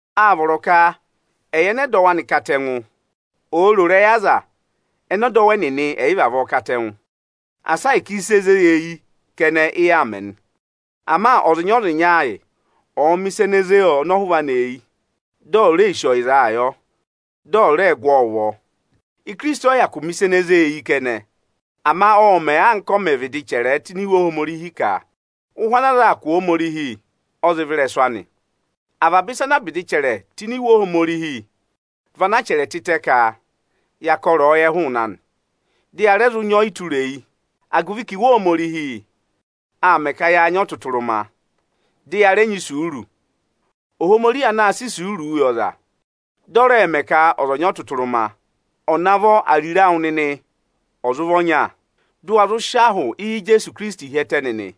Â vọrọ ka ẹyị ẹnẹ ẹdọwụ anị katẹngụ, òo ro ịrẹyị aza ẹnẹ ẹdọwụ ẹnịnị ẹ̀yị vavọọ katẹngụ! Asa ahịka ịsị e zé yi eyi kẹnẹ, ị yaa mẹ nị! Ama ọzịnya-ọzịnya ayị ọ̀ọ mẹ̀ ịsa ene zé ọnọhụva anị eyi, di ò ree sì ọyịzaa yọ, dị ọ̀ rẹẹ gụ ọọ ụvọ! Ikirisiti ọyị hyakụ mẹ̀ ịsa ene ze eyi kẹnẹ. Ama ộ mẹ̀, anka a mẹ̀ vịdị chẹrẹẹ tụ́ ini Iwe Ohomorihi ka ụhụ ana aza aa kụ̀ Ohomorihi, ọ zị vẹ ịrẹsụ anị. Avaba ịsa anaa ịsa anaa vịdị chẹrẹ tụ́ ini Iwe Ohomorihi vị anaa chẹrẹ tịtẹ ka ya kọ ịrẹyọyẹ hụụnị anị; dị ya rẹ zụ nyị ọyịtureyi, agụvị ka Iwe Ohomorihi aa mẹ ka yaa nyị ọtụtụrụma, dị ya rẹ nyị isuuru. Ohomorihi anaā sịị isuuruu yị ọza, dị ọ rẹẹ̄ mẹ ka ọza ọ̀ nyị ọtụtụrụma, ọ̀ navọ ariro awụ nịnị ọ̀ zụ vị ọnya, dụ wa zụụ sị ahụ Ijeesu Ikirisiti hi ẹtẹ nịnị!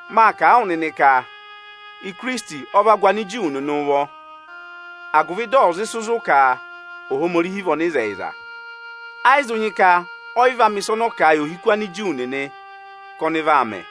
Mâ kà a wụ nịnị ka Ikirisiti ọ va gụ Aniju nịnị ụvọ, agụvị dị ọ̀ zụ sị zụ̀ ka Ohomorihi vị ọnịzẹyịza. Ayị zụ nyị ka ọyị vaa mẹ̀ ịsa ọnọọ kà a yị ohiku Aniju nịnị ka ọnị vaa mẹ.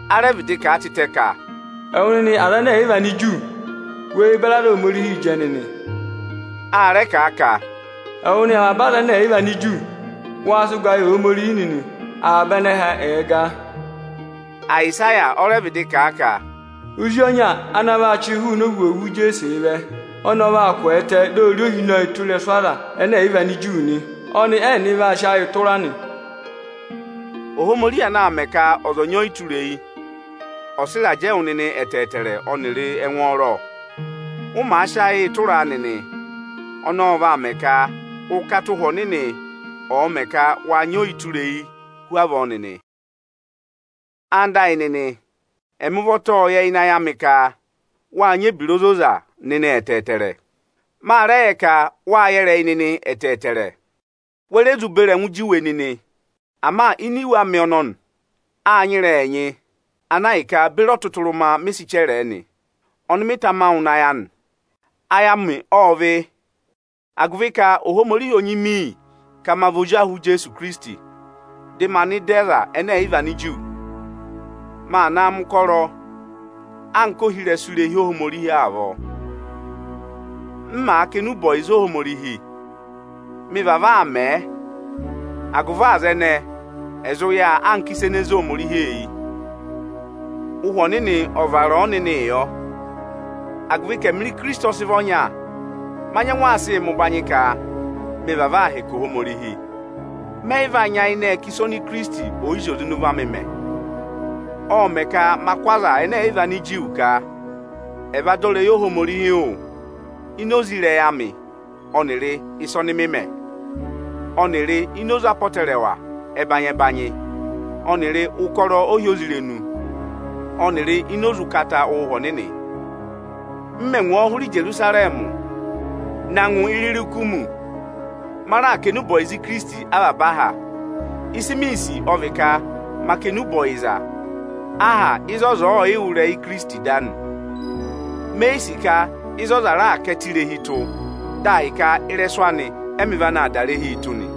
A rẹ vịdị kà a tịtẹ ka, “Ẹwụ nịnị Anigiriki, we beri aza Ohomorihi jẹ nịnị!” A rẹ kà a ka, “Ẹwụ nịnị avaba Anigiriki, waa sị ụgaa yị Ohomorihi nịnị, avaba anẹhẹ ẹ̀ẹ gaa!” Ayịsaya ọ rẹ vịdị kà a ka, “Ozi ọnya ana vaa chịị hụụnị ovwoovu Ijeesee vẹ, ọnị ọ vaa kwẹẹtẹ, dị ọ̀ rị ohinọyị tụ́ ịrẹsụ Anigiriki nị. Ọnị ẹ́nịnị vaa sị ayịị tụra nị.” Ohomorihi anaā mẹ ka ọza ọ̀ nyị ọyịtureyi, ọ̀ sị ịrajẹ yị wụ nịnị ẹtẹẹtẹrẹ ọnịrị ẹngwọọrọ, ụ màa sị ayịị tụraa nịnị. Ọnọọ vaa mẹ ka ụkata Ụhwẹ Ọnịnị ọ̀ mẹ ka wâ nyị oyitureyii hu avọọ nịnị. Ẹwụ nịnị ẹyịnyara amị, ẹmị ụvọta ộ yẹ ịnị ayị amị ka wâ nyị ebira ozoza nịnị ẹtẹẹtẹrẹ. Ma rẹ yẹ ka wa yẹ ịrẹyị nịnị ẹtẹẹtẹrẹ; we re zụ beri ẹngụ juwe nịnị. Ama ini iwe amị ọnọnị, â nyị ịrẹyị ẹnyị, ana ahịka beri ọtụtụrụma mị sị chẹrẹẹ nị, ọnị mị tama wụ nịnị ayị anị. Ayị amị ộ vị́, agụvị ka Ohomorihi ô nyị mị iyi ka ma vị ozi ahụ Ijeesu Ikirisiti dị maa nọ ịda Anigiriki. Maa naa mẹ̀ ụkọrọ anka ohirẹsụ irehi Ohomorihi avọọ, m màa kà enube ọyịza Ohomorihi. Mị vavọọ aa mẹ, agụvị aza ẹnẹẹ ẹ̀ zụ yà anka ịsa ene zé Ohomorihi eyi. Ụhwẹ Ọnịnị ộ vara a ọnịnịị yọ. Agụvị ka ẹmịrị Ikirisiti ọ sị vị ọnya, ma nyẹngụ aa sịị mẹ ụbanyị ka mị vavọọ aa hẹkẹ Ohomorihi. Mẹ yị vaa nyayịnẹ ẹ kà ịsa oni Ikirisiti ọ̀ yị zị oze ịnị ụvọ amị mẹ. Ộ mẹ ka ma kụ́ Anigiriki ka ẹ̀ va dọ ịrẹyị Ohomorihi wụ́ ini oze ịrẹyị amị ọnịrị ịsa ọnị mị mẹ ọnịrị ini oze apọtẹrẹwa ẹbanyị-ẹbanyị ọnịrị ụkọrọ ohyozirenu ọnịrị ini oze ụkata Ụhwẹ Ọnịnị. M mẹ̀ ngwọọ hụrẹ Ijerusarẹmị na ngụ Iririkumi, ma raà kà enube ọyịza Ikirisiti avaba aha. Ịsị miī sì ọ vị ka ma kà enube ọyịza aha ịzị ọza ọọ̀ yị wụ́ ịrẹyị Ikirisiti da nị. Me yi sì ka ịzị ọza raà ká ẹtẹ irehi tụ́, dị ahịka ị́rẹsụ anị ẹ́mị vana naa dà irehii tụ́ nị.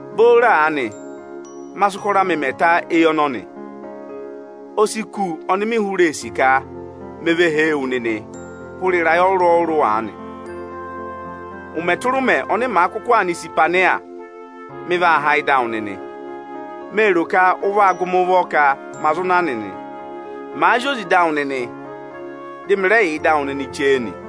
Booro aanị, ma sị ụkọrọ amị mẹ ta éyi ọnọnị. O si kù oni mi hụrẹ ee sì ka me ve hee wu nịnị hụrẹ ịrayị ọrụrụ-ọrụrụ aanị. Ụmẹ tụra ụmẹ ọnị màa kụkụ aa nọ Isipeni, mị vaa há ịda awụ nịnị. Mee ro ka ụ vaa gụ mị ụvọ ka ma zụ na nịnị, màa zị oze ịda awụ nịnị, dị mị raà yà ịda awụ nịnị chee nị.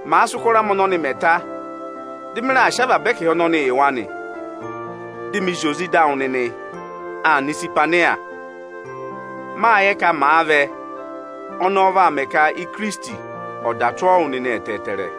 Màa sị ụkọrọ amị ọnọnị mẹ ta, dị mị raà sị avaba ẹkẹhị ọnọnị yị wa nị, di mi zị oze ịda awụ nịnị aa nọ Isipeni. Mâ yẹ ka màa vẹ, ọnọọ vaa mẹ ka Ikirisiti ọ̀ dà tụ́ ọọ wụ nịnị ẹtẹẹtẹrẹ.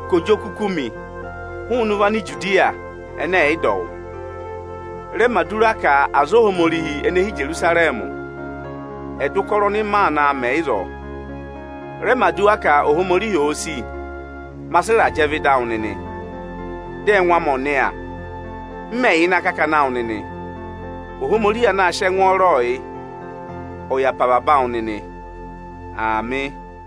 ka ò jị oku kú mi hụụnị ụvọ Anijudiya ẹnẹ ẹ̀ yị dọ wụ́. Rẹ mẹ̀ aduwa ka aza Ohomorihi ene hi Ijerusarẹmị, ẹ̀ dọ ụkọrọ ọnị maa naa mẹ ịzọọ! Rẹ mẹ̀ aduwa ka Ohomorihi òo sì, ma sị ịrajẹ vẹ ịda awụ nịnị, dị ẹngụ amị ọ̀ nịya, m mẹ̀ yà ịnị akakana awụ nịnị! Ohomorihi anaā sịị ẹngwọọrọọ yị, ọ̀ yà pe avaba awụ nịnị Aamị.